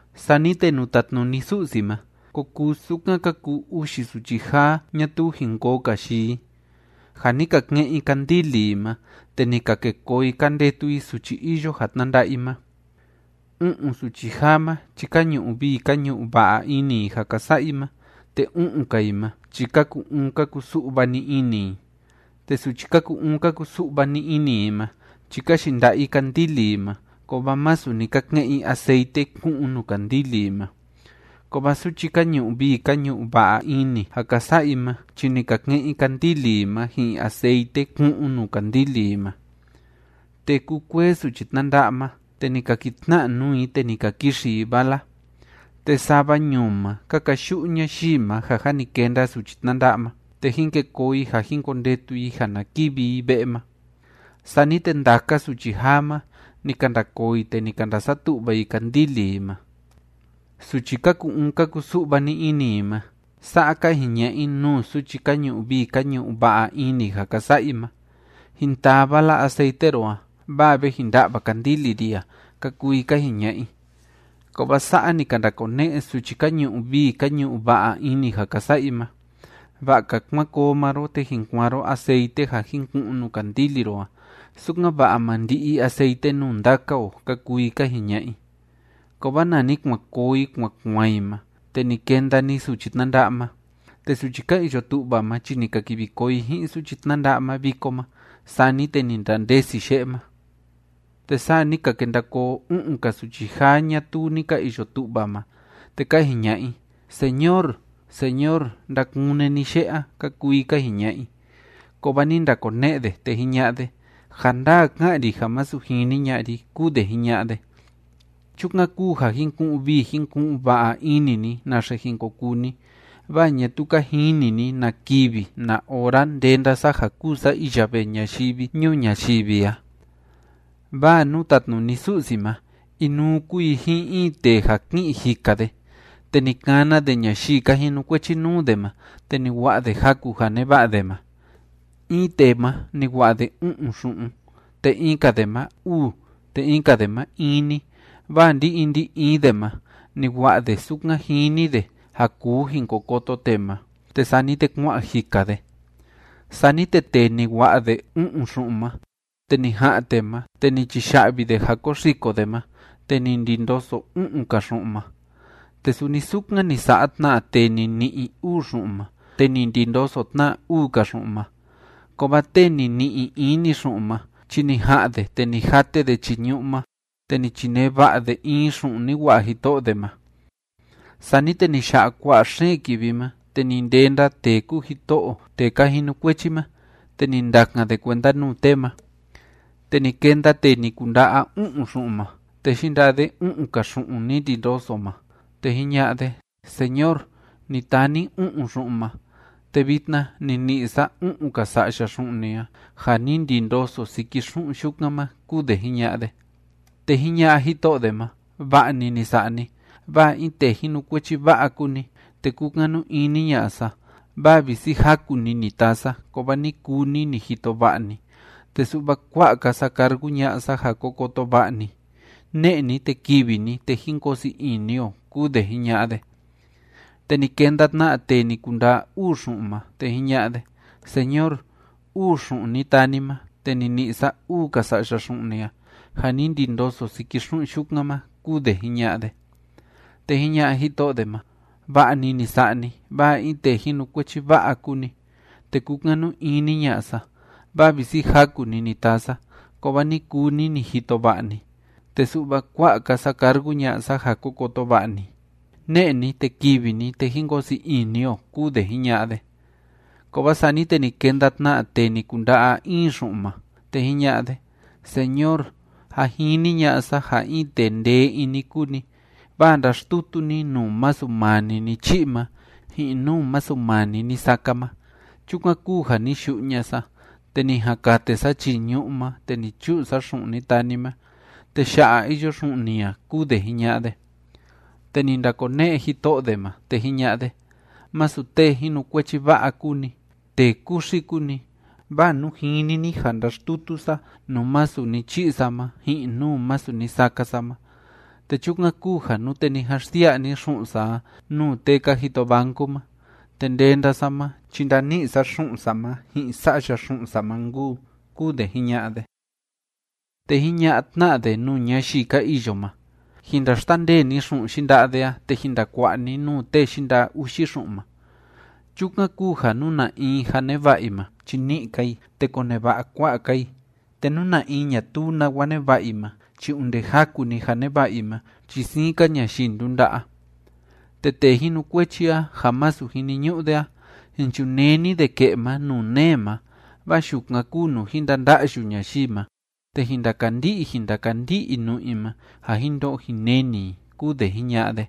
’Sani te nuu tatnuni Su'si ma ko kuu sukan ka kuu uxi suchi jaa ñatuu jin koo‑ka yii i, ja ni ka ke'en i kandili i ma, te ni ka ke koo i ka ndetu i suchi iyo ja tnanda'a i ma. U'un suchi jaa ma chi ka ñu'u vii ka ñu'u va'a ini i ja ka sa'a i ma, te u'un‑ka i ma chi ka ku‑uun ka kusu'va‑ni ini i. Te suchi ka ku‑uun ka kusu'va‑ni ini i ma chi ka yinda'a i kandili i ma, kovaa masu ni ka ke'en i aceite ku'un nuu kandili i ma. Kovaa suchi ka ñu'u vii ka ñu'u va'a ini ja ka sa'a i ma chi ni ka ke'en i kandili i ma ji'in aceite ku'un nuu kandili i ma. Te kúkuee suchi tnanda'a ma, te ni ka kitna'a nuu i, te ni ka kixi i vala. ’Te sava ñuu ma ka kayu'u ñayii ma ja jâ ni kenda suchi tnanda'a ma, te jín ke koo i ja jin kondetu i ja na kivi i ve'e ma. Sani te ndaka suchi jaa ma, ni ka ndakoo i, te ni ka ndasatu'va i kandili i ma. Suchi ka ku‑uun ka kusu'va‑ni ini i ma, sa'a ka jiña'a i nuu suchi ka ñu'u vii ka ñu'u va'a ini ja ka sa'a i ma: “Jin taa vala aceite ro a, vaa ve jin nda'va kandili ri a”, ka kuu i ka jiña'a i. Kovaa sa'a ni ka ndakone'e suchi ka ñu'u vii ka ñu'u va'a ini ja ka sa'a i ma: “Va'a‑ka kuán koo maa ro, te jin kuaan ro aceite ja jin ku'un nuu kandili ro a, sukan‑va'a ma ndi'i aceite nuu ndaka o”, ka kuu i ka jiña'a i. ’Kovaa nani kuan koo i kuan kuaan i ma, te ni kenda‑ni suchi tnanda'a ma, te suchi ka iyo tu'va ma chi ni ka kivi koo i ji'in suchi tnanda'a ma viko ma, sani te ni ndandesi ye'e ma. Te saa ni ka ndenda koo u'un‑ka suchi jaa ñatuu ni ka iyo tu'va ma, te ka jiña'a i: “Señor, señor, ndakune ni ye'e a”, ka kuu i ka jiña'a i. Kovaa ni ndakone'e de, te jiña'a de: “Ja ndaa ká'an ri ja masu jini ña'a ri”, kúu de jiña'a de. Chukan kúu ja jin ku'un vii jin ku'un va'a ini ni naxe jin ko kuu ni, vaa ñatuu ka jini ni na kivi na ora ndenda sa ja kúu sa iya vee ñayivi ñuu ñayivi a. ’Vaa nuu tatnuni Su'si ma inuu kúu i ji'in in tee ja ki'in jika de, te ni kana de ñayii ka jinukuechi nuu de ma, te ni wa'a de jaku ja neva'a de ma. In tee ma, ni wa'a de u'un xu'un, te in‑ka de ma, uu, te in‑ka de ma, in‑ni, vaa ndi‑in ndi‑in de ma ni wa'a de sukan jini de ja kuu jin ko koto tee ma, te sani te kua'an jika de. Sani te tee ni wa'a de u'un xu'un ma, te ni ja'an tee ma, te ni chiya'vi de ja ko xiko de ma, te ni ndindoso u'un‑ka xu'un ma. Te suni sukan ni sa'a tna tee ni ni'i uu xu'un ma, te ni ndindoso tna uu‑ka xu'un ma. Kovaa tee ni ni'i in‑ni xu'un ma chi ni ja'an de, te ni jate de chii ñu'ú ma, te ni chinee va'a de in xu'un ni wa'a jito'o de ma. ’Sani te ni ya'a kua'a xeen kivi ma, te ni ndenda tee kúu jito'o tee ka jinukuechi ma, te ni ndakan de kuenda nuu tee ma. Te ni kenda tee ni kunda'a u'un xu'un ma, te yinda'a de u'un‑ka xu'un ni ndindoso ma, te jiña'a de: “Señor, ni taa ni u'un xu'un ma, te vitna ni ni'i sa u'un‑ka sa'ya xu'un ni a, ja ni ndindoso siki xu'un yukan ma”, kúu de jiña'a de. Te jiña'a jito'o de ma: “Va'a‑ni ni sa'a ni, vaa in tee jinukuechi va'a kúu ni, te kúkanu ini ña'a sa, vaa visi jaku‑ni ni taa sa, kovaa ni kuu ni, ni jito va'a ni, te su'va kua'a‑ka sacargu ña'a sa ja ko koto va'a ni. Ne'e ni, te kivi ni, te jín koo sii ini o”, kúu de jiña'a de. ’Te ni kenda tna tee ni kunda'a uu xu'un ma, te jiña'a de: “Señor, uu xu'un ni taa ni ma, te ni ni'i sa uu‑ka sa'ya xu'un ni a, ja ni ndindoso siki xu'un yukan ma”, kúu de jiña'a de. Te jiña'a jito'o de ma: “Va'a‑ni ni sa'a ni, vaa in tee jinukuechi va'a kúu ni, te kúkanu ini ña'a sa, vaa visi jaku‑ni ni taa sa, kovaa ni kuu ni, ni jito va'a ni, te su'va kua'a‑ka sacargu ña'a sa ja ko koto va'a ni. Ne'e ni, te kivi ni, te jín koo sii ini o”, kúu de jiña'a de. ’Kovaa sani te ni kenda tna tee ni kunda'a in xu'un ma, te jiña'a de: “Señor, jâ jini ña'a sa ja in tee ndee ini kúu ni, vaa ndaxtutu ni nuu masu maa ni ni chi'i ma, ji'in nuu masu maa ni ni saka ma. Chukan kúu ja ni yu'u ña'a sa, te ni jan kate sa chii ñu'ú ma, te ni chu'u sa xu'un ni taa ni ma. Te ya'a iyo xu'un ni a”, kúu de jiña'a de. Te ni ndakone'e jito'o de ma, te jiña'a de: “Masu tee jinukuechi va'a kúu ni. Tee kuxi kúu ni. Vaa nú jini ni ja ndáxtutu sa nuu masu ni chi'i sa ma ji'in nuu masu ni saka sa ma, te chukan kúu ja nute ni jan xsia'a ni xu'un sa a nuu tee ka jito bancu ma, te ndenda sa ma chi ndani'i sa xu'un sa ma ji'in sa'ya xu'un sa ma nkuu”, kúu de jiña'a de. Te jiña'a tna de nuu ñayii ka iyo ma: “Jin ndaxtandee ni xu'un yinda'a de a, te jin ndakua'a ni nuu tee yinda'a uxi xu'un ma. Chukan kúu ja nú na in jâ neva'a i ma chi ni'i‑ka i, te koneva'a kua'a‑ka i, te nú na in ñatuu nawa neva'a i ma chi onde jaku‑ni ja neva'a i ma chi siin‑ka ñayii ndunda'a. Te tee jinukuechi a, ja masu jiniñu'u de a, jin chunee ni de ke'e ma nuu nee ma, vaa yukan kúu nuu jin ndanda'yu ñayii ma, te jin ndakandi'i jin ndakandi'i i nu'u i ma ja jin ndo'o jin neni i”, kúu de jiña'a de.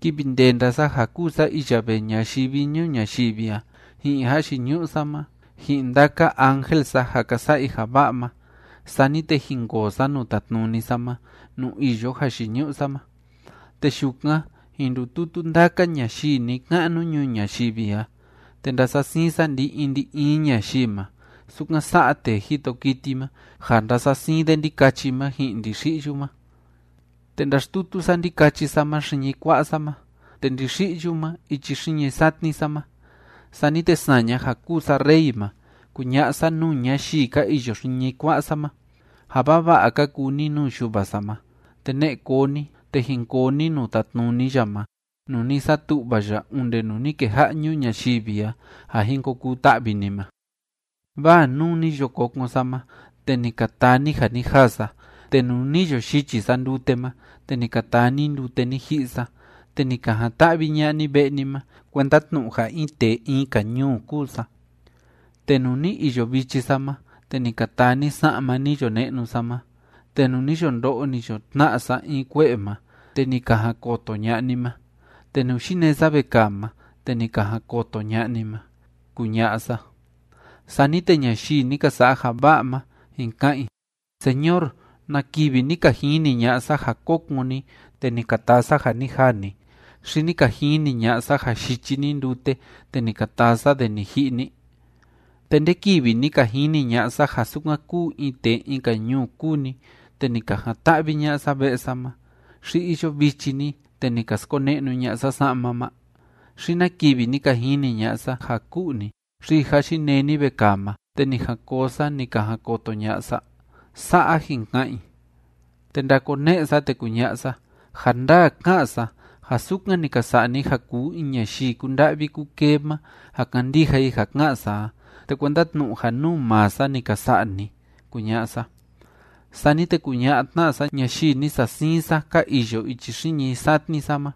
’Kivi ndenda sa ja kúu sa iya vee ñayivi ñuu ñayivi a ji'in jayiñu'u sa ma ji'in ndaka ángel sa ja ka sa'a i ja va'a ma, sani te jinkoo sa nuu tatnuni sa ma, nuu iyo jayiñu'u sa ma. Te yukan jin ndututu ndaka ñayii ni‑ka'nu ñuu ñayivi a, te ndasasiin sa ndi‑in ndi‑in ñayii ma, sukan sa'a tee jito kiti ma, ja ndasasiin de ndikachi ma ji'in ndixi'yu ma. Te ndaxtutu sa ndikachi sa ma xiñi kua'a sa ma, te ndixi'yu ma ichi xiñi satni sa ma. ’Sani te saña ja kúu sa rey ma, kuña'a sa nuu ñayii ka iyo xiñi kua'a sa ma: “Ja vava'a ka kuu ni nuu Yuva sa ma, te ne'e koo ni, te jin koo ni nuu tátnuni ya ma nuu ni satu'va ya onde nuu ni keja'a ñuu ñayivi a ja jin ko kuu ta'vi ni ma. Vaa nuu ni yo kokon sa ma, te ni ka taa ni ja ni jaa sa, te nuu ni yo yichi sa ndute ma, te ni ka taa ni ndute ni ji'i sa, te ni ka jan‑ta'vi ña'a ni ve'e ni ma kuenda tnu'u ja in tee in‑ka ñuu kúu sa. Te nuu ni iyo vichi sa ma, te ni ka taa ni sa'ma ni yo ne'nu sa ma, te nuu ni yo ndo'o, ni yo tna'a sa in kue'e ma, te ni ka jan koto ña'a ni ma, te nuu yinee sa vekaa ma, te ni ka jan koto ña'a ni ma”, kuña'a sa. ’Sani te ñayii ni ka sa'a ja va'a ma, jin ka'an i: “Señor, ¿na kivi ni ka jini ña'a sa ja kókon ni te ni ka taa sa ja ni jaa ni, xi ni ka jini ña'a sa ja yíchi ni ndute te ni ka taa sa de ni ji'i ni? ¿Te nde kivi ni ka jini ña'a sa ja sukan kúu in tee in‑ka ñuu kúu ni, te ni ka jan‑ta'vi ña'a sa ve'e sa ma, xi iyo vichi ni te ni ka skone'nu ña'a sa sa'ma ma? ¿Xi na kivi ni ka jini ña'a sa ja ku'u ni xi ja yinee ni vekaa ma, te ni jan koo sa ni ka jan koto ña'a sa?” Sa'a jin ka'an i. ’Te ndakone'e sa, te kuña'a sa: “Ja ndaa ká'an sa ja sukan ni ka sa'a ni ja kuu in ñayii kúnda'vi kúkee ma ja kándija i ja ká'an sa a, te kuenda tnu'u ja nuu maa sa ni ka sa'a ni”, kuña'a sa. ’Sani te kuña'a tna sa ñayii ni sa'a siin sa ka iyo ichi xiñi satni sa ma: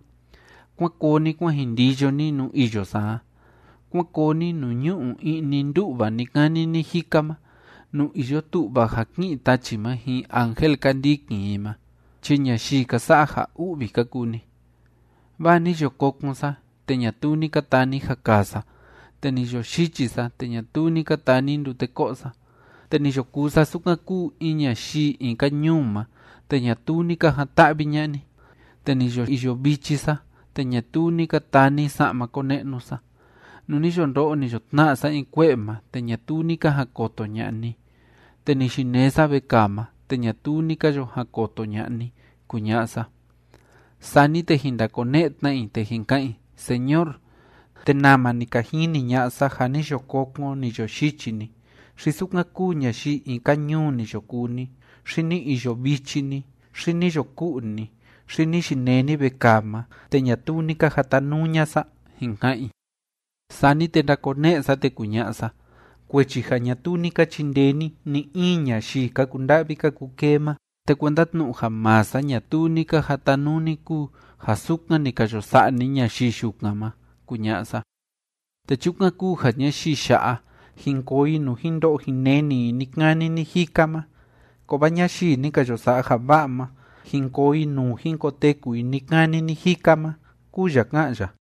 “Kuán koo ni kuán jin ndiyo ni nuu iyo sa a. Kuán koo ni nuu ñu'u i'ni ndú'va ni‑kani ni‑jika ma, nuu iyo tu'va ja ki'in tachi ma ji'in ángel ka ndikin i ma chi ñayii ka sa'a ja u'vi ka kuu ni. Vaa ni yo kokon sa, te ñatuu ni ka taa ni ja kaa sa, te ni yo yichi sa, te ñatuu ni ka taa ni ndute ko'o sa. Te ni yo kuu sa sukan kúu in ñayii in‑ka ñuu ma, te ñatuu ni ka jan‑ta'vi ña'a ni, te ni yo iyo vichi sa, te ñatuu ni ka taa ni sa'ma kone'nu sa. Nuu ni yo ndo'o ni yo tna'a sa in kue'e ma, te ñatuu ni ka jan koto ña'a ni, te ni yinee sa vekaa ma, te ñatuu ni ka yo jan koto ña'a ni”, kuña'a sa. ’Sani te jin ndakone'e tna i, te jin ka'an i: “Señor, ¿te nama ni ka jini ña'a sa ja ni yo kokon, ni yo yichi ni, xi sukan kúu ñayii in‑ka ñuu ni yo kuu ni, xi ni iyo vichi ni, xi ni yo ku'u ni, xi ni yinee ni vekaa ma, te ñatuu ni ka jatanuu ña'a sa?”, jin ka'an i. ’Sani te ndakone'e sa, te kuña'a sa: “Kuechi ja ñatuu ni ka chindee ni ni‑in ñayii ka kunda'vi ka kukee ma, te kuenda tnu'u ja maa sa ñatuu ni ka jatanuu ni kúu ja sukan ni ka yo sa'a ni ñayii yukan ma”, kuña'a sa. ’Te chukan kúu ja ñayii ya'a jin koo i nuu jin ndo'o jin neni i ni‑kani ni‑jika ma, kovaa ñayii ni ka yo sa'a ja va'a ma, jin koo i nuu jin koteku i ni‑kani ni‑jika ma ―kúu ya ká'an ya.